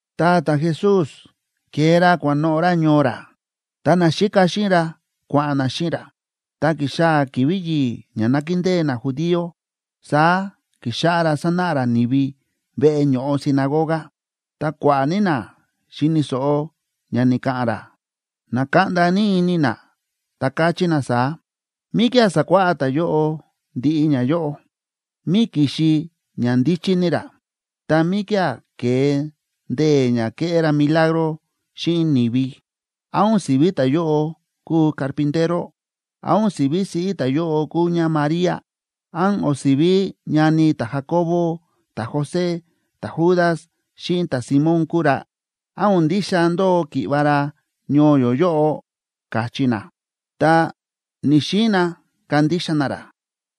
Ta ta̱Jesús ke̱e ra kua̱noꞌo̱ ra ñoo ra, ta naxíka xíꞌin ra kua̱ꞌa̱n na xíꞌin ra. Tá ki̱xaa̱ ki̱vi̱ yi̱i̱ ña nákindée najudío, saá ki̱xáꞌá ra sánáꞌa ra ni̱vi veꞌe ño̱ꞌo sinagoga, ta kua̱ꞌa̱ ní na xi̱ni̱ so̱ꞌo ña ni̱ka̱ꞌa̱n ra, na̱kaꞌnda ní ini na, ta káchí na saá: ―¿Míkía̱ sa̱kuáꞌá ta̱yóꞌo ndiꞌi ñayóꞌo? ¿Mí ki̱xi ña ndíchí ní ra, ta míkía̱ ke̱e ndee̱ ña kéꞌé ra milagro xíꞌin ni̱vi? ¿Án o̱n si̱ví ta̱yóꞌo kúu carpintero? ¿Án o̱n si̱ví siꞌí ta̱yóꞌo kúu ñáMaría? ¿Án o̱n si̱ví ñani ta̱Jacobo, ta̱José, ta̱Judas xíꞌin ta̱Simón kúu ra? ¿Án o̱n ndixa ndóo ki̱ꞌva̱ ra ñoo yó yóꞌo? ―káchí na. Ta ni̱‑xiin na kandixa na ra.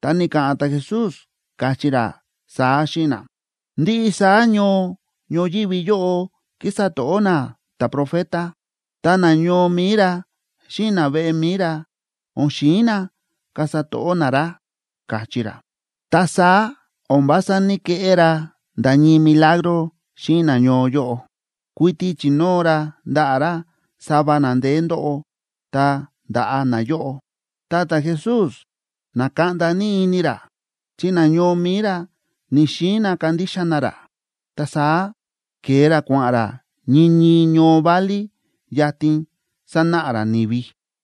Ta ni̱ka̱ꞌa̱n ta̱Jesús, káchí ra saá xíꞌin na: ―Ndiꞌi saá ñoo ñoyívi yóꞌo kísa to̱ꞌó na ta̱profeta, ta nañoo mi̱i ra xíꞌin naveꞌe mi̱i ra o̱n xi̱in na kasa to̱ꞌó na ra ―káchí ra. Ta saá o̱n vása ní‑keꞌé ra nda̱ ñii milagro xíꞌin nañoo yóꞌo. Kuiti chi̱nóo ra ndaꞌa̱ ra sava na ndeé ndóꞌo, ta nda̱ꞌa nayóꞌo. Ta ta̱Jesús na̱kaꞌnda ini ra chi nañoo mi̱i ra ni̱‑xiin na kandixa na ra. Ta saá ke̱e ra kua̱ꞌa̱n ra ñii ñii ñoo válí yatin sánáꞌa ra ni̱vi.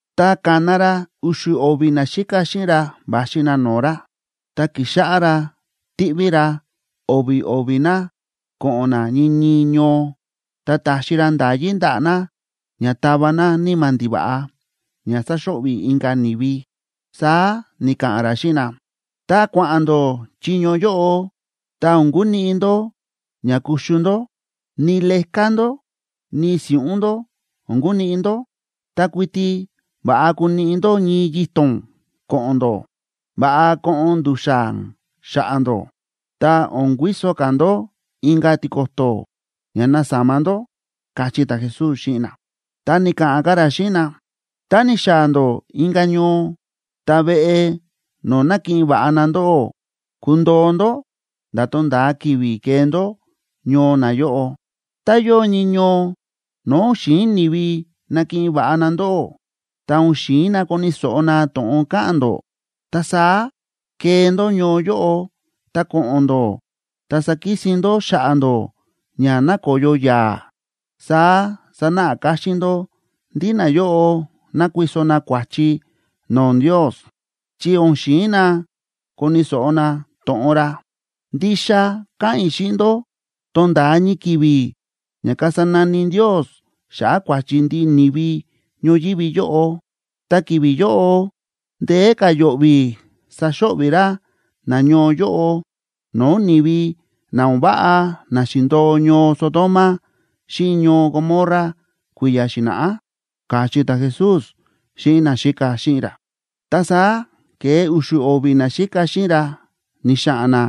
Ta ka̱na ra u̱xu̱ o̱vi̱ naxíka xíꞌin ra va̱xi na no̱o̱ ra, ta ki̱xáꞌá ra tíꞌví ra o̱vi̱ o̱vi̱ na ko̱ꞌo̱n na ñii ñii ñoo, ta ta̱xi ra nda̱yí ndaꞌa̱ na ña tava na níma̱ ndiva̱ꞌa ña sáxo̱ꞌvi̱ inka̱ ni̱vi. Saá ni̱ka̱ꞌa̱n ra xíꞌin na: ―Tá kua̱ꞌa̱n ndó chiño yóꞌo, ta o̱n kuniꞌi ndó ña kuxu ndó, ni leká ndó, ni si̱ꞌún ndó o̱n kuniꞌi ndó. Ta kuiti va̱ꞌa kuniꞌi ndó ñii yito̱na ko̱ꞌo̱n ndó. Va̱ꞌa koꞌon ndu̱xa̱n xa̱ꞌa̱ ndó, ta o̱n kuiso ka̱ ndó inka̱ tiko̱to̱ ña nasama ndó ―káchí ta̱Jesús xíꞌin na. Ta ni̱ka̱ꞌa̱n ka̱ ra xíꞌin na: ―Tá ni̱xaa̱ ndó inka̱ ñoo, ta veꞌe no̱o̱ nakiꞌin va̱ꞌa na ndóꞌó, kundoo ndó nda̱ tonda̱a ki̱vi̱ kee ndó ñoo nayóꞌo. Tá yóo ñii ñoo no̱o̱ o̱n xi̱in ni̱vi nakiꞌin va̱ꞌa na ndóꞌó, ta o̱n xi̱in na koni̱ so̱ꞌo na to̱ꞌon ka̱ꞌa̱n ndó, ta saá kee ndó ñoo yóꞌo, ta ko̱ꞌo̱n ndó, ta sakisin ndó xa̱ꞌa̱ ndó ña nakoyo yaa̱. Saá sanáꞌa káxín ndó ndí nayóꞌo nákuiso na kua̱chi no̱o̱ Ndios, chi o̱n xi̱in na koni̱ so̱ꞌo na to̱ꞌon ra. Ndixa káꞌa̱n i̱ xíꞌin ndó, tonda̱a ñii ki̱vi̱ ña kasa nani Ndios xa̱ꞌa̱ kua̱chi ndiꞌi ni̱vi ñoyívi yóꞌo, ta ki̱vi̱ yóꞌo ndeé ka̱ yo̱ꞌvi̱ saxo̱ꞌvi̱ ra nañoo yóꞌo no̱o̱ ni̱vi na o̱n váꞌa na xi̱ndo̱o ñoo Sodoma xíꞌin ñoo Gomorra kui̱ya̱ xi̱na̱ꞌá ―káchí ta̱Jesús xíꞌin naxíka xíꞌin ra. Ta saá ke̱e u̱xu̱ o̱vi̱ naxíka xíꞌin ra ni̱xa̱ꞌa̱n na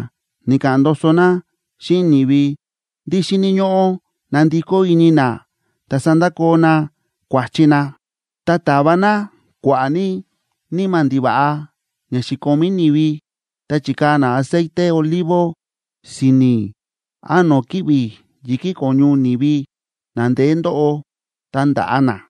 ni̱ka̱ꞌa̱n ndoso na xíꞌin ni̱vi ndí xíni̱ ñóꞌó nandikó ini na ta sandakoo na kua̱chi na. Ta ta̱va na kua̱ꞌa̱ ní níma̱ ndiva̱ꞌa ña xi̱komí ni̱vi, ta chi̱kaa̱ na aceite olivo si̱ni̱ án no̱o̱ kíꞌvi̱ yi̱kí ko̱ñu ni̱vi na ndeé ndóꞌo, ta nda̱ꞌa na.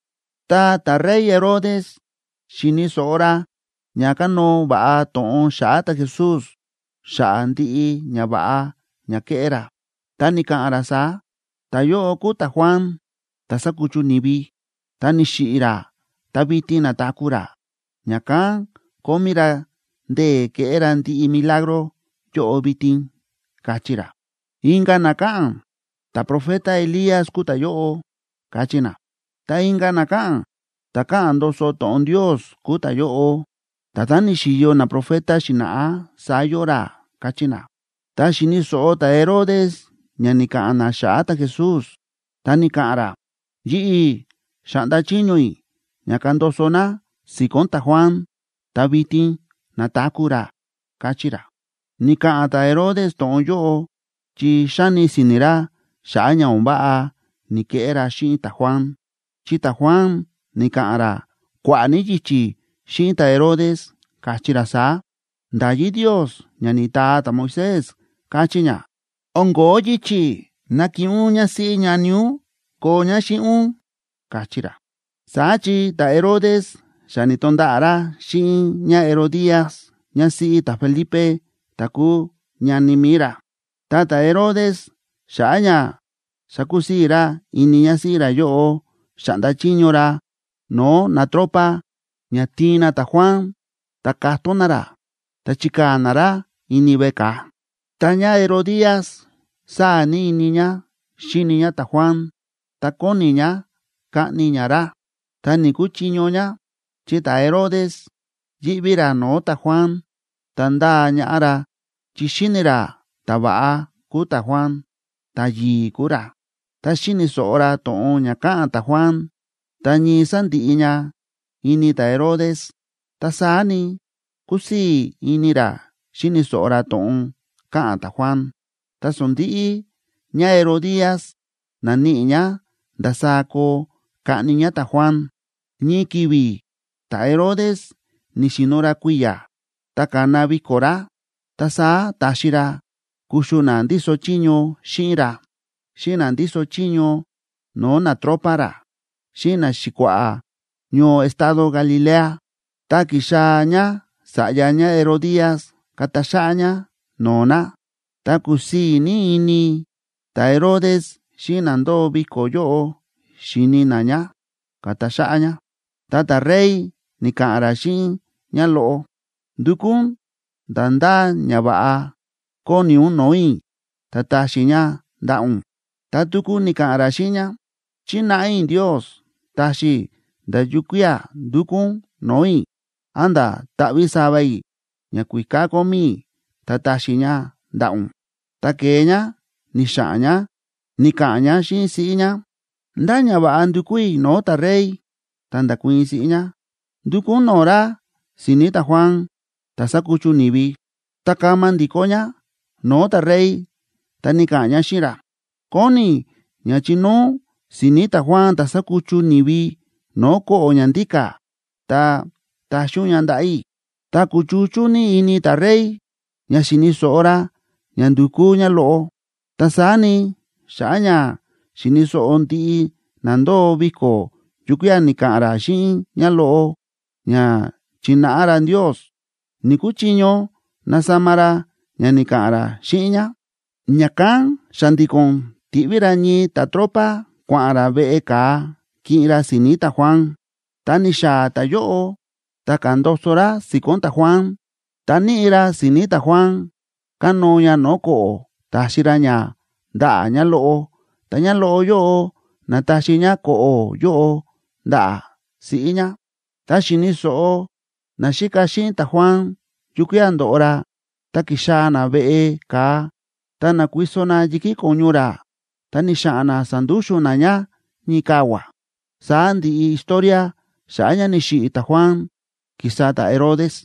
Ta ta̱rey Herodes xi̱ni̱ so̱ꞌo ra ña kánóo va̱ꞌa to̱ꞌon xa̱ꞌa̱ ta̱Jesús xa̱ꞌa̱ ndiꞌi ñava̱ꞌa ña ke̱ꞌé ra. Ta ni̱ka̱ꞌa̱n ra saá: ―Ta̱yóꞌo kúu ta̱Juan, ta̱ sa̱kuchu ni̱vi, ta ni̱xiꞌi̱ ra ta vitin na̱taku̱ ra, ña̱kán kómí ra ndee̱ kéꞌé ra ndiꞌi milagro yóꞌo vitin ―káchí ra. Inka̱ na káꞌa̱n: ―Ta̱profeta Elías kúu ta̱yóꞌo ―káchí na. Ta inka̱ na káꞌa̱n: ―Ta̱ káꞌa̱n ndoso to̱ꞌon Ndios kúu ta̱yóꞌo, nda̱tán ni̱xi̱yo naprofeta xi̱na̱ꞌá, saá yóo ra ―káchí na. Ta xi̱ni̱ so̱ꞌo ta̱Herodes ña ni̱ka̱ꞌa̱n na xa̱ꞌa̱ ta̱Jesús, ta ni̱ka̱ꞌa̱n ra: ―Yi̱ꞌi̱ xa̱ꞌnda chiño i̱ ña kandoso na si̱ko̱n ta̱Juan. Ta vitin na̱taku̱ ra ―káchí ra. Ni̱ka̱ꞌa̱n ta̱Herodes to̱ꞌon yóꞌo chi xáni si̱ni̱ ra xa̱ꞌa̱ ña o̱n váꞌa ni̱keꞌé ra xíꞌin ta̱Juan. Chi ta̱Juan ni̱ka̱ꞌa̱n ra kua̱ꞌa̱ ní yichi̱ xíꞌin ta̱Herodes, káchí ra saá: ―Nda̱yí Ndios ña ni̱taa ta̱Moisés káchí ña, o̱n ko̱ó yichi̱ nakiꞌin ún ñásíꞌí ñani ún koo ñá xíꞌin ún ―káchí ra. Saá chi ta̱Herodes xa ni̱to̱nda̱ꞌa̱ ra xíꞌin ñáHerodías ñásíꞌí ta̱Felipe ta̱ kúu ñani mi̱i ra. Ta ta̱Herodes, xa̱ꞌa̱ ña sakusii̱ ra ini ñásíꞌí ra yóꞌo, xa̱ꞌnda chiño ra no̱o̱ natropa ña tiin na ta̱Juan, ta ka̱tón na ra, ta chi̱kaa̱ na ra ini veꞌe ka̱a. Ta ñáHerodías sáa̱ ní ini ñá xíni ñá ta̱Juan ta kóni ñá kaꞌni ñá ra. Ta ni̱‑kuchiño ñá; chi ta̱Herodes yíꞌví ra no̱o̱ ta̱Juan, ta ndáa ñaꞌá ra chi xi̱ni̱ ra ta̱va̱ꞌa kúu ta̱Juan, ta̱yi̱i̱ kúu ra. Ta xíni̱ so̱ꞌo ra to̱ꞌon ña káꞌa̱n ta̱Juan ta ñii sándiꞌi ña ini ta̱Herodes, ta saá ni, kúsii̱ ini ra xíni̱ so̱ꞌo ra to̱ꞌon káꞌa̱n ta̱Juan. Ta sondi̱ꞌi ñáHerodías na̱níꞌi ñá ndasaá koo kaꞌni ñá ta̱Juan. Ñii ki̱vi̱ ta̱Herodes ni̱xi̱no̱ ra kui̱ya̱ ta ka̱na viko̱ ra, ta saá ta̱xi ra kuxu na ndíso chiño xíꞌin ra, xíꞌin na ndíso chiño no̱o̱ natropa ra, xíꞌin naxi̱kua̱ꞌa̱ ñoo estado Galilea. Ta ki̱xaa̱ ñása̱ꞌya ñáHerodías ka̱ta xáꞌá ñá no̱o̱ na, ta kúsii̱ ní ini ta̱Herodes xíꞌin na ndóo viko̱ yóꞌo xíni na ñá, ka̱ta xáꞌá ñá. Ta ta̱rey ni̱ka̱ꞌa̱n ra xíꞌin ñáloꞌo: ―Ndukú ún nda̱ ndá ñava̱ꞌa kóni ún no̱o̱ i̱, ta taxi i̱ ña ndaꞌa̱ ún. Ta tuku ni̱ka̱ꞌa̱n ra xíꞌin ñá: ―Chínáꞌa i̱ Ndios taxi i̱ nda̱ yukía̱ ndúkú ún no̱o̱ i̱, a̱nda̱ taꞌví sava i̱ ñakuíká kómí i̱ ta taxi i̱ ña ndaꞌa̱ ún. Ta ke̱e ñá ni̱xa̱ꞌa̱n ñá ni̱ka̱ꞌa̱n ñá xíꞌin siꞌí ñá: ―¿Ndá ñava̱ꞌa ndukú i̱ no̱o̱ ta̱rey? Ta nda̱kuii̱n siꞌí ñá: ―Ndukú ún no̱o̱ ra si̱ni̱ ta̱Juan ta̱ sa̱kuchu ni̱vi. Ta kama ndi̱kó ñá no̱o̱ ta̱rey ta ni̱ka̱ꞌa̱n ñá xíꞌin ra: ―Kóni i̱ ña chinóo ún si̱ni̱ ta̱Juan ta̱ sa̱kuchu ni̱vi, no̱o̱ ko̱ꞌo̱ ña ndíka̱, ta taxi ún ña ndaꞌa̱ i̱. Ta kúchuchú ní ini ta̱rey ña xi̱ni̱ so̱ꞌo ra ña ndu̱kú ñáloꞌo, ta saá ni, xa̱ꞌa̱ ña xi̱ni̱ so̱ꞌo ndiꞌi na ndóo viko̱ yukía̱ ni̱ka̱ꞌa̱n ra xíꞌin ñáloꞌo ña chi̱náꞌa ra Ndios, ni̱‑kuchiño nasama ra ña ni̱ka̱ꞌa̱n ra xíꞌin ñá. Ña̱kán xa̱ndi̱ko̱n ti̱ꞌví ra ñii ta̱tropa kua̱ꞌa̱n ra veꞌe ka̱a kiꞌin ra si̱ni̱ ta̱Juan. Ta ni̱xaa̱ ta̱yóꞌo, ta ka̱ndoso ra si̱ko̱n ta̱Juan, ta níꞌi ra si̱ni̱ ta̱Juan kánóo ña no̱o̱ ko̱ꞌo̱ ta̱xi ra ña ndaꞌa̱ ñáloꞌo, ta ñáloꞌo yóꞌo na̱taxi ñá ko̱ꞌo̱ yóꞌo ndaꞌa̱ siꞌí ñá. Tá xi̱ni̱ so̱ꞌo naxíka xíꞌin ta̱Juan yukía̱ ndo̱ꞌo ra, ta ki̱xaa̱ na veꞌe ka̱a ta na̱kuiso na yi̱kí ko̱ñu ra, ta ni̱xa̱ꞌa̱n na sa̱ndúxu̱n na ña ñii kavua̱. Saá ndi̱ꞌi historia xa̱ꞌa̱ ña ni̱xiꞌi̱ ta̱Juan, ki̱sa ta̱Herodes.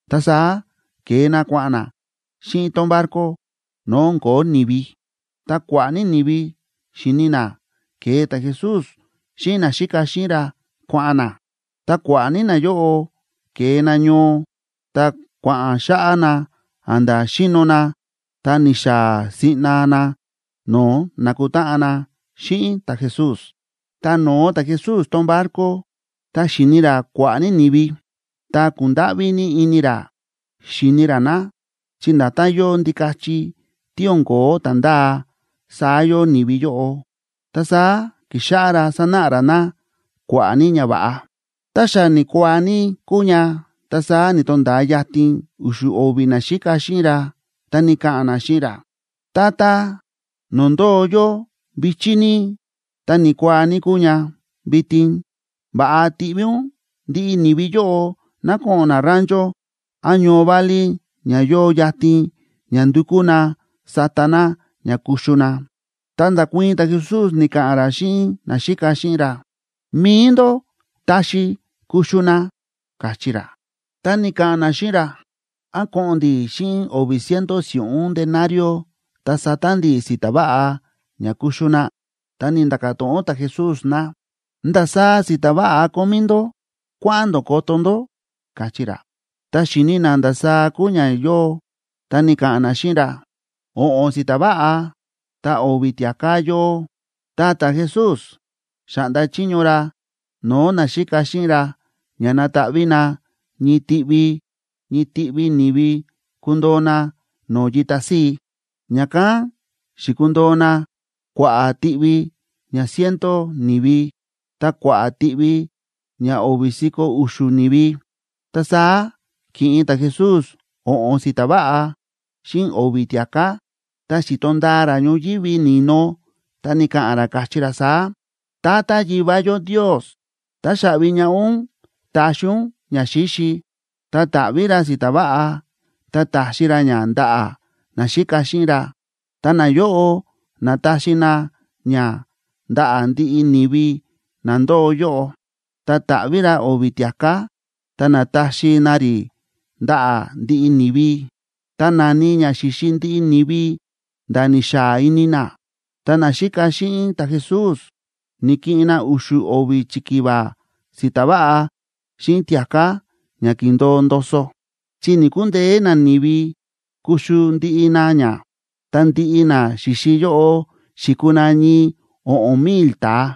Ta saá ke̱e na kua̱ꞌa̱n na xíꞌin tón barco no̱o̱ o̱n ko̱ó ni̱vi. Ta kua̱ꞌa̱ ní ni̱vi xi̱ni na ke̱e ta̱Jesús xíꞌin naxíka xíꞌin ra kua̱ꞌa̱n na. Ta kua̱ꞌa̱ ní nayóꞌo ke̱e na ñoo, ta kua̱ꞌa̱n xáꞌá na a̱nda̱ xíno na, ta ni̱xaa̱ siꞌna na no̱o̱ nakutáꞌan na xíꞌin ta̱Jesús. Tá no̱o ta̱Jesús tón barco, ta xi̱ni ra kua̱ꞌa̱ ní ni̱vi, ta kúndáꞌví ní ini ra xíni ra na, chi nda̱tán yóo ndikachi tí o̱n ko̱ó ta̱ ndáa, saá yóo ni̱vi yóꞌo. Ta saá ki̱xáꞌá ra sánáꞌa ra na kua̱ꞌa̱ ní ñava̱ꞌa. Ta xa ni̱kuaa ní kúu ña, ta saá ni̱to̱nda̱a yatin u̱xu̱ o̱vi̱ naxíka xíꞌin ra, ta ni̱ka̱ꞌa̱n na xíꞌin ra: ―Tata, no̱o̱ ndóo yó vi̱chí ní, ta ni̱kuaa ní kúu ña vitin. Va̱ꞌa tiꞌví ún ndiꞌi ni̱vi yóꞌo ná ko̱ꞌo̱n na rancho án ñoo válí ña yóo yatin ña ndukú na sata na ña kuxu na. Ta nda̱kuii̱n ta̱Jesús, ni̱ka̱ꞌa̱n ra xíꞌin naxíka xíꞌin ra: ―Mi̱i ndó taxi kuxu na ―káchí ra. Ta ni̱ka̱ꞌa̱n na xíꞌin ra: ―¿Án ko̱ꞌo̱n ndi̱ xíꞌin o̱vi̱ ciento si̱ꞌún denario,b ta sata ndi̱ si̱ta̱ váꞌa ña kuxu na? Ta ni̱nda̱ka̱ to̱ꞌon ta̱Jesús na: ―¿Ndasaá si̱ta̱ váꞌa kómí ndó? Kua̱ꞌa̱n ndó koto ndó ―káchí ra. Ta xi̱ni na ndasaá kúu ña yóo, ta ni̱ka̱ꞌa̱n na xíꞌin ra: ―O̱ꞌo̱n si̱ta̱ váꞌa ta o̱vi̱ tia̱ká yóo. Ta ta̱Jesús xa̱ꞌnda chiño ra no̱o̱ naxíka xíꞌin ra ña nataꞌví na ñii tiꞌvi ñii tiꞌvi ni̱vi kundoo na no̱o̱ yita síi. Ña̱kán xi̱kundoo na kua̱ꞌa̱ tiꞌvi ña ciento ni̱vi ta kua̱ꞌa̱ tiꞌvi ña o̱vi̱ si̱ko̱ u̱xu̱ ni̱vi. Ta saá ki̱ꞌin ta̱Jesús o̱ꞌo̱n si̱ta̱ váꞌa xíꞌin o̱vi̱ tia̱ká, ta xi̱to ndaa ra ñoyívi ni̱no, ta ni̱ka̱ꞌa̱n ra, káchí ra saá: ―Tata Yivá yó Ndios, táxaꞌvi ñaꞌá ún ta̱xi ún ñaxíxi. Ta ta̱ꞌví ra si̱ta̱ váꞌa, ta ta̱xi ra ña ndaꞌa̱ naxíka xíꞌin ra, ta nayóꞌo na̱taxi na ña ndaꞌa̱ ndiꞌi ni̱vi na ndóo yóꞌo. Ta ta̱ꞌví ra o̱vi̱ tia̱ká ta na̱taxi na rí ndaꞌa̱ ndiꞌi ni̱vi. Ta na̱ni ña xi̱xi ndiꞌi ni̱vi nda̱ ni̱xaa ini na, ta naxíka xíꞌin ta̱Jesús na̱kiꞌin na u̱xu̱ o̱vi̱ chikiva si̱ta̱ váꞌa xíꞌin tia̱ká ña ki̱ndo̱o ndoso, chi ni̱‑kundeé nani̱vi kuxu ndiꞌi na ña. Ta ndiꞌi na xi̱xi yóꞌo xi̱kuu na ñii o̱ꞌo̱n mil ta̱a.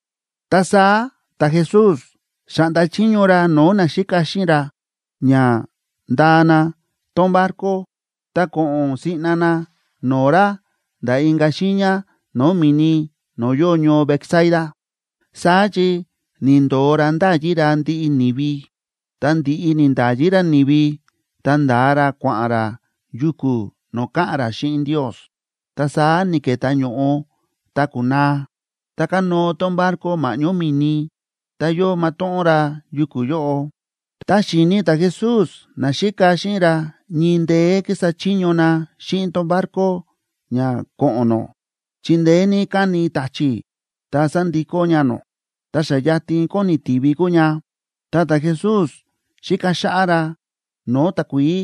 Ta saá ta̱Jesús xa̱ꞌnda chiño ra no̱o̱ naxíka xíꞌin ra ña ndaa na tón barco ta ko̱ꞌo̱n siꞌna na no̱o̱ ra nda̱ inka̱ xiiña no̱o̱ mi̱ni no̱o̱ yóo ñoo Betsaida, saá chi ni̱ndo̱o ra nda̱yi ra ndiꞌi ni̱vi. Ta ndi̱ꞌi ni̱nda̱yi ra ni̱vi, ta nda̱a ra kua̱ꞌa̱n ra yuku̱ no̱o̱ ka̱ꞌa̱n ra xíꞌin Ndios. Ta saá ni̱ke̱tá ño̱ꞌo ta ku̱naa, ta kánóo tón barco ma̱ꞌñó mi̱ni, ta yóo matóꞌón ra yuku̱ yóꞌo. Ta xi̱ni ta̱Jesús naxíka xíꞌin ra ñii ndeé ki̱sa chiño na xíꞌin tón barco ña ko̱ꞌo̱n nó, chi ndeé ní káni ta̱chi̱ ta sa̱ndikó ña nó. Ta xa yatin kóni tivi kúu ña,c ta ta̱Jesús xíka xáꞌá ra no̱o̱ takuií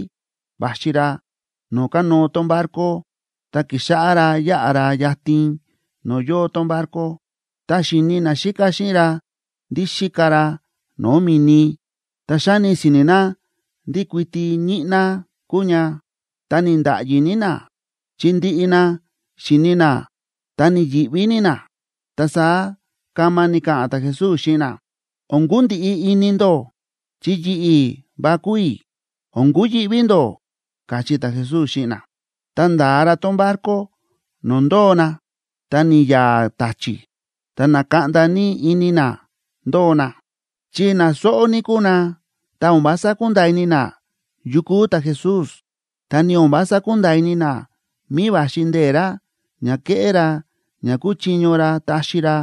va̱xi ra no̱o̱ kánóo tón barco. Ta ki̱xáꞌá ra yáꞌa ra yatin no̱o̱ yóo tón barco. Ta xi̱ni naxíka xíꞌin ra ndí xíka ra no̱o̱ mi̱ni, ta xa̱ni si̱ni̱ na ndí kuiti ñíꞌná kúu ña. Ta ni̱nda̱ꞌyi ní na, chi ndiꞌi na xi̱ni na, ta ni̱yi̱ꞌví ní na. Ta saá kama ni̱ka̱ꞌa̱n ta̱Jesús xíꞌin na: ―O̱n kundiꞌi ini ndó, chi yi̱ꞌi̱ va kúu i̱. O̱n kuyi̱ꞌví ndó ―káchí ta̱Jesús xíꞌin na. Ta nda̱a ra tón barco no̱o̱ ndóo na, ta ni̱ya̱a̱ ta̱chi̱. Ta na̱kaꞌnda ní ini na ndóo na, chi na sóꞌó ní kúu na, ta o̱n vása kúnda̱a̱ ini na yu kúu ta̱Jesús, ta ni o̱n vása kúnda̱a̱ ini na mí va̱xi ndee̱ ra ña kéꞌé ra ña kúchiño ra taxi ra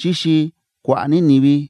xíxi kua̱ꞌa̱ ní ni̱vi.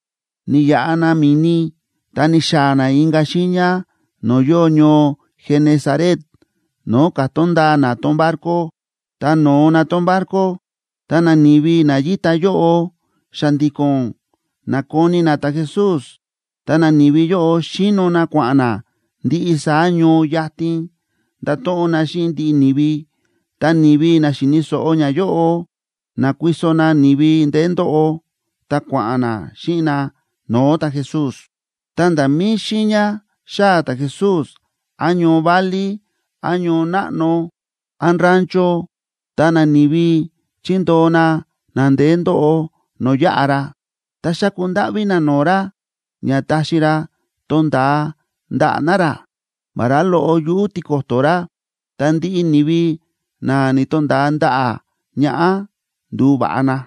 Ni̱yaꞌa na mi̱ni ta ni̱xaa̱ na inka̱ xiiña no̱o̱ yóo ñoo Genesaret no̱o̱ ka̱tón ndaa na tón barco. Tá no̱o na tón barco, ta nani̱vi na yíta yóꞌo xa̱ndi̱ko̱n na̱koni na ta̱Jesús. Ta nani̱vi yóꞌo xi̱no na kua̱ꞌa̱n na ndiꞌi saá ñoo yatin nda̱to̱ꞌon na xíꞌin ndiꞌi ni̱vi, ta ni̱vi na xi̱ni̱ so̱ꞌo ñayóꞌo, na̱kuiso na ni̱vi ndeé ndóꞌo ta kua̱ꞌa̱n na xíꞌin na no̱o̱ ta̱Jesús. Ta nda̱ mí xiiña xáa̱ ta̱Jesús, án ñoo válí, án ñoo náꞌno, án rancho, ta nani̱vi chi̱ndoo na na ndeé ndóꞌo no̱o̱ yáꞌa ra. Ta xa̱ku ndáꞌví na no̱o̱ ra ña taxi ra tonda̱a ndaꞌa̱ na ra, vará loꞌo yuꞌu̱ tiko̱to̱ ra, ta ndiꞌi ni̱vi na ni̱to̱nda̱a ndaꞌa̱ ñaꞌá ndu̱va̱ꞌa na.